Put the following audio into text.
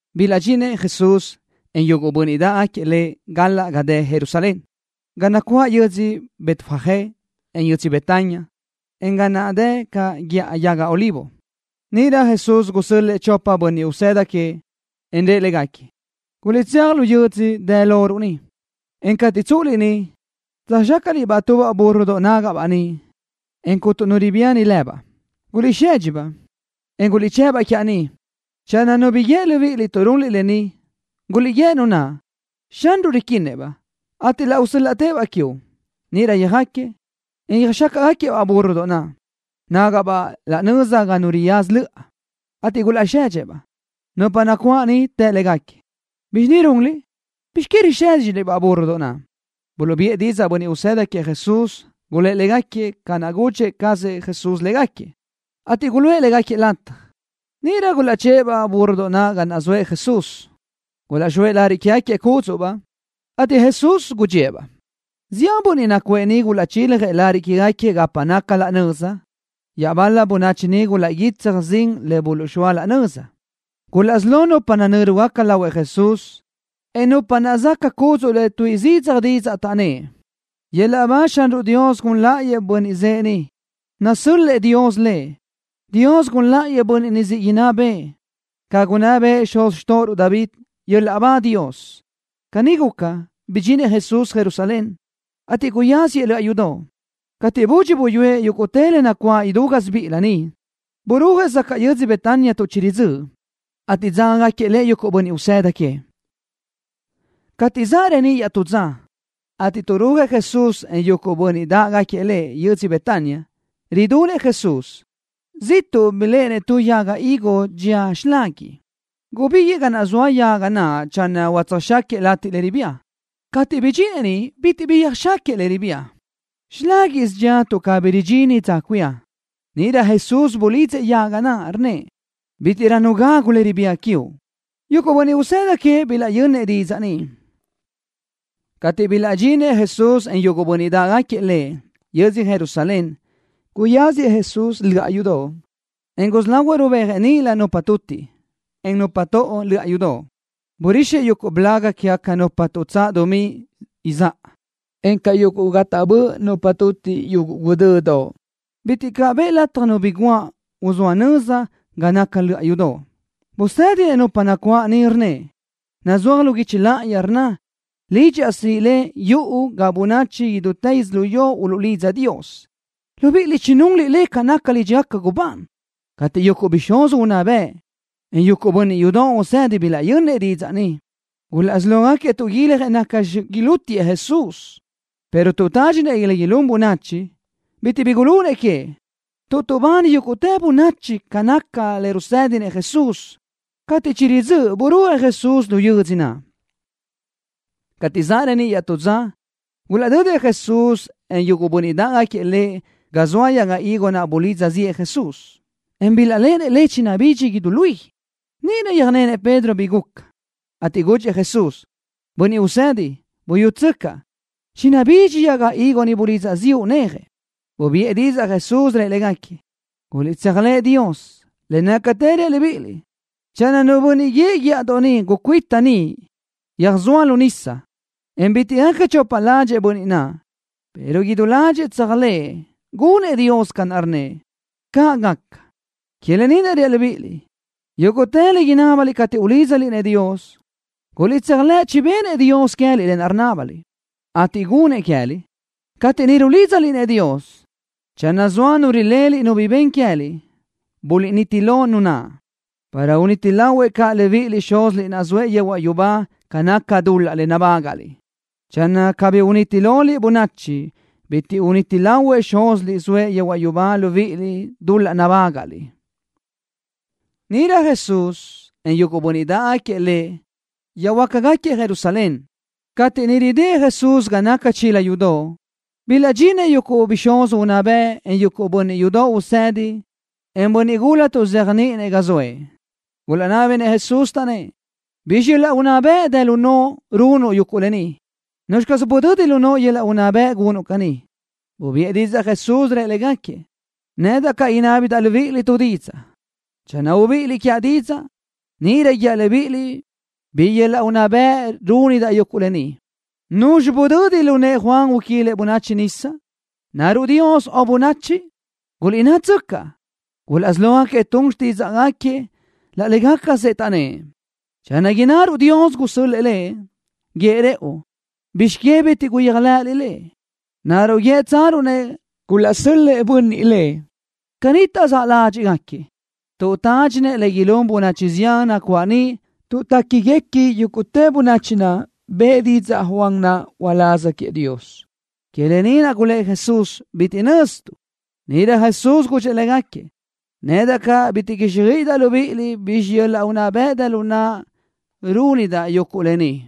Bilaʼdxinëʼ Jesús, en yuguʼ bönniʼ dáʼgaquiëʼ Lëʼ galaʼ ga dë Jerusalén, ga naʼ nacuáʼ yödzö Betfagé, en yödzö Betania, en ga naʼ dë caʼ Guíʼa Yaga Olivo. Níʼirö Jesús gusö́l-lëʼë chopëʼ bönniʼ usëda queëʼ, en rëʼ légaquiëʼ: —Guliʼtséaj lu yö́dzödoʼ dë loruʼ niʼ, en cateʼ tsúʼuliʼ niʼ, tsöjxácaʼliʼ-baʼ tubaʼ búrrodoʼ nágaʼbaʼ niʼ, en cuntu nu ribíani lëbaʼ. Guliʼsedxi-baʼ, en guliʼchë́ʼ-baʼ quiaʼ ni. Channö nu bi guíë libíʼiliʼ tuʼ runliʼ lë ni, guliʼguíë nu naʼ: “Xanruʼ riquinnëʼ-baʼ, ateʼ laʼ usö́l-laʼtëʼ-baʼ quiuʼ.” Níʼirö yöjáquiëʼ, en yöjxácaʼgaquiëʼ-baʼ búrrodoʼ naʼ, nágaʼbaʼ raʼ nöza ga nu riyaza löʼa, ateʼ gulaʼsedxëʼ-baʼ. Nupa nacuáʼ niʼ të légaquiëʼ: —¿Bizxi ni runliʼ? ¿Bizx que risédxiliʼ-baʼ búrrodoʼ naʼ? Buluʼbiʼë didzaʼ bönniʼ usëda queëʼ Jesús, gulë́ʼ légaquiëʼ ca naʼ chigudxi cazëʼ Jesús légaquiëʼ, ateʼ guluʼë légaquiëʼ lataj. Níʼirö gulaʼchë́ʼë-baʼ búrrodoʼ naʼ ga naʼ zoëʼ Jesús. Gulaʼxóëʼ lariʼ quégaquiëʼ cúdzuʼbaʼ, ateʼ Jesús gudxíëʼ-baʼ. Zián bönniʼ nacuʼë niʼ gulaʼchiljëʼ lariʼ quégaquiëʼ gapa naca laʼ nöza. Iaʼbal-la bönachi niʼ gulaʼguítsaj zin le buluʼzxóa laʼ nöza. Gulaʼsí lo nupa nanö́rugaca lahuëʼ Jesús, en nupa naʼ záʼgaca cúdzuʼlëʼ tuíʼi zidzaj didzaʼ, taʼnnë́ʼ: —¡Yöl-laʼ ba! ¡Xanruʼ Dios gun láʼayëʼ Bönniʼ zëʼë ni, nasö́l-lëʼë Dios Lëʼ! ¡Dios gun láʼayëʼ Bönniʼ ni siʼ inná bëʼë, ca naʼ gunná bëʼë xuz xtóʼoruʼ David! ¡Yöl-laʼ ba Dios! Caní guca, bidxinëʼ Jesús Jerusalén, ateʼ guyáziëʼ löʼa yudoʼ. Cateʼ budxi buyúëʼ yúguʼtë le nacuáʼ idú gásibiʼilö niʼ, burúajëʼ zacaʼ yödzö Betania tuʼ chiridzö́ʼ, ateʼ dzágagaquiëʼ Lëʼ yuguʼ bönniʼ usëda queëʼ. Cateʼ zaʼ reníʼ iaʼtú dza, ateʼ tuʼrúajëʼ Jesús, en yuguʼ bönniʼ dáʼgaquiëʼ Lëʼ yödzö Betania, ridunëʼ Jesús. Ziʼtuʼ biléʼenëʼ tu yaga higo dxía xilaguiʼ. Gubíguiʼë ga naʼ zoa yaga naʼ channö utsöjxaquiëʼ latiʼ le ribía. Cateʼ bidxinëʼ niʼ bitiʼ bi yöjxáquiëʼ le ribía. Xiláguiʼsö dxía tuʼ cabí ridxini dza cuía. Níʼirö Jesús bulidzëʼ yaga naʼ, rnnëʼ: —Bítiʼrö nu gagu le ribía quiuʼ. Yuguʼ bönniʼ usëda queëʼ bilaʼyönnëʼ didzaʼ ni. Cateʼ bilaʼdxinëʼ Jesús, en yuguʼ bönniʼ dáʼgaquiëʼ Lëʼ, yödzö Jerusalén, guyáziëʼ Jesús löʼa yudoʼ, en gusí lahuëʼ rubéajëʼ níʼilö nupa tutiʼ, en nupa toʼo lu löʼa yudoʼ. Burixëʼ yuguʼ blaga quégaca nupa tuʼtsáʼ dumí izáʼa, encaʼ yuguʼ ga taʼbö́ʼ nupa tutiʼ yuguʼ guʼdödoʼ. Bitiʼ caʼ bëʼë lataj nu bi guáʼ, uzóa nöza ga naca löʼa yudoʼ. Busë́dinëʼ nupa nacuáʼ niʼ, rnnëʼ: —Nazúaj lu guichi láʼayi, rnna: “Lidxaʼ siʼi le, yuʼu ga bönachi idútë yödzölió uluʼlidza Dios.” Libíʼiliʼ chinunliʼ le ca naca lídxigaca gubán. Cateʼ yuguʼ bixúz unná bëʼ, en yuguʼ bönniʼ yudoʼ usedi bilaʼyönnëʼ didzaʼ ni, gulaʼsí lógaquiëʼ tuʼguiljëʼ nacxi ilútiëʼ Jesús, pero tuʼ tádxinëʼ le ilún bönachi, bitiʼ bi gulunëʼ queëʼ, tuʼ tuʼbani yúguʼtë bönachi ca naca le rusë́dinëʼ Jesús. Cateʼ chiridzö́ʼ burúajëʼ Jesús lu yödzö naʼ. Cateʼ zaʼ reníʼ iaʼtú dza, gulaʼdödëʼ Jesús, en yuguʼ bönniʼ dáʼgaquiëʼ Lëʼ ga zoa yaga higo naʼ bulidza ziʼë Jesús, en bilaʼléʼenëʼ le, chinabidxi idú luí. Níʼirö yöjnenëʼ Pedro bi guca, ateʼ gudxëʼ Jesús: —Bönniʼ Usedi, buyútsöcaʼ. Chinabidxi yaga higo ni bulidza ziʼu néaje. Bubiʼë didzaʼ Jesús, rëʼ légaquiëʼ: —Guliʼtseajlëʼ Dios. Le nácatë reaʼ libíʼiliʼ, channö nu bönniʼ guíëʼ guíʼadoʼ ni: “Gucuíta ni, yöjsóa lu nísadoʼ”, en bitiʼ gaca chopa ládxëʼë bönniʼ naʼ, pero idú ládxëʼë tseajlëʼë gunëʼ Dios ca naʼ rnnëʼ, caʼ gaca. Que lë ni naʼ reaʼ libíʼiliʼ: Yúguʼtë le inábaliʼ cateʼ ulídzaliʼ-nëʼ Dios, guliʼtséajlëʼ chibennëʼ Dios queë́liʼ lë naʼ rinábaliʼ, ateʼ gunnëʼ queë́liʼ. Cateʼ niʼ rulídzaliʼ-nëʼ Dios, channö zoa nu rileliʼ nu bi ben queë́liʼ, buliʼniti lo nu naʼ, para uniti lahuëʼ caʼ libíʼiliʼ Xúziliʼ naʼ zoëʼ yehuaʼ yubá ca naca dul-laʼ nabágaʼliʼ. Channö cabí uniti loliʼ bönachi, bitiʼ uniti lahuëʼ Xúziliʼ zoëʼ yehuaʼ yubá libíʼiliʼ dul-laʼ nabágaʼliʼ. Níʼirö Jesús, en yuguʼ bönniʼ dáʼgaquiëʼ Lëʼ yöjhuö́jgaquiëʼ Jerusalén. Cateʼ niʼ ridë́ʼ Jesús ga naca chila yudoʼ, bilaʼdxinëʼ yuguʼ bixúz unná bëʼ, en yuguʼ bönniʼ yudoʼ usedi, en bönniʼ gula tuʼzéajniʼinëʼ, ga zoëʼ. Gulaʼnábinëʼ Jesús, taʼnnë́ʼ: —¿Bizxi yöl-laʼ unná bëʼ dë lu noʼo runuʼ yuguʼ lë ni? ¿Nuzxi caz budödi lu noʼo yöl-laʼ unná bëʼ gunuʼ caní? Bubiʼë didzaʼ Jesús, rëʼ légaquiëʼ: —Nedaʼ caʼ inábidaʼ libíʼiliʼ tu didzaʼ. Channö ubíʼiliʼ quiaʼ didzaʼ, níʼirö guíaʼ libíʼiliʼ bi yöl-laʼ unná bëʼ rúnidaʼ yuguʼ lë ni. ¿Nuzxi budödi lu nëʼë Juan uquilëʼ bönachi nisa? ¿Naruʼ Dios o bönachi? Guliʼnnátsöcaʼ. Gulaʼsí lógaquiëʼ tun xtídzaʼgaquiëʼ laʼ légacasëʼ, taʼnnë́ʼ: —Channö innaruʼ Dios gusö́l-lëʼë lëʼ, guíëʼ rëʼu: “¿Bizx que bitiʼ guyéajlëʼëliʼ lëʼ?” ¿Naruʼ guíëtsaruʼ-nëʼ: Gulaʼsö́l-lëʼë bönniʼ lëʼ? Caní taʼzáʼ ládxiʼgaquiëʼ tuʼ tádxinëʼ le ilún bönachi zián nacuáʼ niʼ tuʼ téquiguequi yúguʼtë bönachi naʼ bëʼë didzaʼ Juan naʼ uláz queëʼ Dios. Que lë ni naʼ gulë́ʼ Jesús: —Bitiʼ nöztuʼ. Níʼirö Jesús gudxëʼ légaquiëʼ: —Nedaʼ caʼ bitiʼ quíxjöiʼidaʼ libíʼiliʼ bi yöl-laʼ unná bëʼ dë lu naʼa rúnidaʼ yuguʼ lë ni.